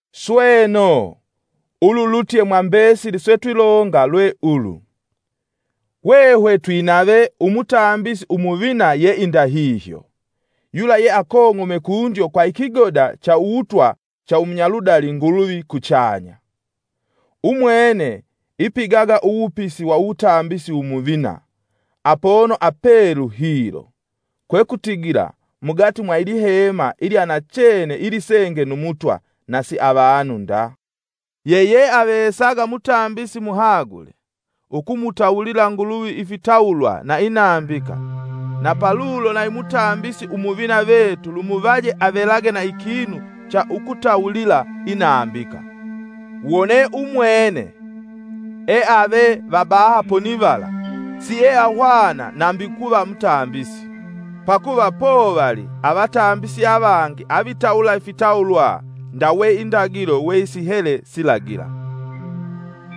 Sweno, ululutye mwa mbesili setwilonga lwe ulu: hwehwe twinave Umutambisi Umuvina yeindahihyo, yula ye akong'ome kundyo kwa ikigoda cha uwutwa cha umunyaludali Nguluvi kuchanya. Umwene ipigaga uwupisi wa umutambisi umuvina apono apelu hilo, kwekutigila mugati mwa ilihema ilya nachene ilisenge nu Mutwa, na si na avanu nda. Yeyeavesaga mutambisi muhagule ukumutawulila Nguluvi ifitawulwa na inambika, na palulo nayi mutambisi Umuvina vetu lumuvaje avelage na ikinu cha ukutawulila inambika. Wone Umwene eave va baha ponivala, sieahwana nambi ukuva mutambisi, pakuva povali avatambisi avangi avitawula ifitawulwa ndawe indagilo we sihele silagila.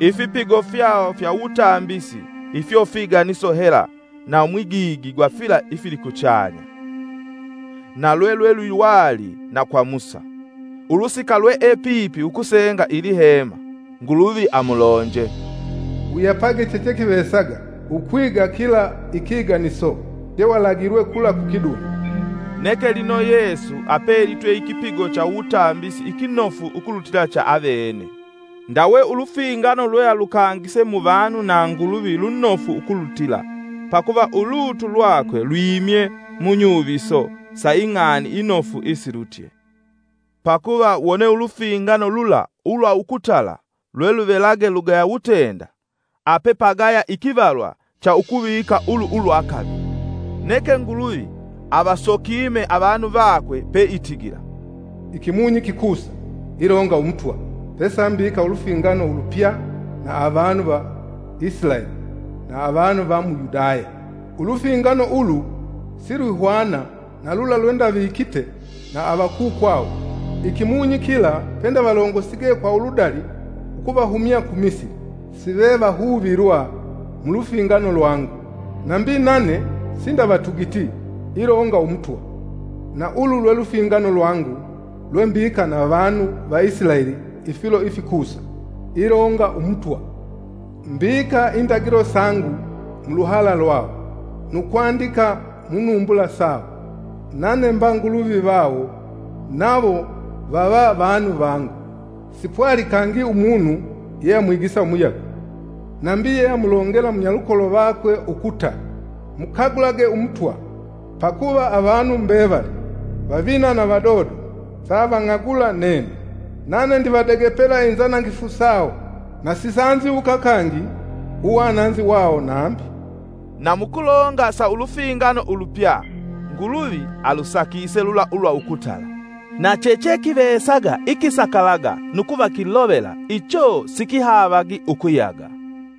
Ifipigo fyawo fya uwutambisi ifyo figaniso hela na mwigigi gwa fila ifilikuchanya. Na lwe lwelwiwali na kwa Musa. Ulusika lweepipi ukusenga ilihema, Nguluvi amulonje, “Wuyapage chechekivesaga ukwiga kila ikiganiso walagilwe kula ku kidunda.” Neke lino Yesu apelitwe ikipigo cha uwutambisi ikinofu ukulutila cha avene, ndawe ulufingano lwealukangise mu vanu na Nguluvi lunofu ukulutila, pakuva ulutu lwakwe lwimye mu nyuviso sa ing'ani inofu isilutye. Pakuva wone ulufingano lula ulwa ukutala lweluvelage lugaya wutenda, apepagaya ikivalwa cha ukuvika ulu ulwa kavili. Neke Nguluvi avasokime avanu vakwe peitigila: “Ikimunyi kikusa, ilonga Umutwa, pesambika ulufingano ulupya na avanu va Isilaeli na avanu va mu Yudaya. Ulufingano ulu silwihwana na lula lwendavikite na avakukwawo ikimunyi kila pendavalongosige kwa uludali ukuvahumya ku Misili. Sivevahuvilwa mu lufingano lwangu; nambi nane sindavatugiti, ilonga Umutwa. Na ulu lwelufingano lwangu lwembika na vanu va Isilaeli ifilo ifikusa, ilonga Umutwa: Mbika indagilo sangu mu luhala lwawo, nu kwandika mu numbula sawo. Nane mba Nguluvi vawo nawo vava vanu vangu. Sipwali kangi umunu yeamwigisa umuyagwe, nambi yeamulongela munyalukolo vakwe ukuta: ‘Mukagulage Umutwa.’ Pakuva avanu mbevali, vavina na vadodo, savang'agula nene. Nane ndivadegepela inzanangifu sawo, na sisanziwuka kangi uwananzi wawo nambi.” Na mukulonga sa ulufingano ulupya, Nguluvi alusakise lula ulwa ukutala; na chechekivesaga ikisakalaga nu kuva kilovela icho sikihaavagi ukuyaga.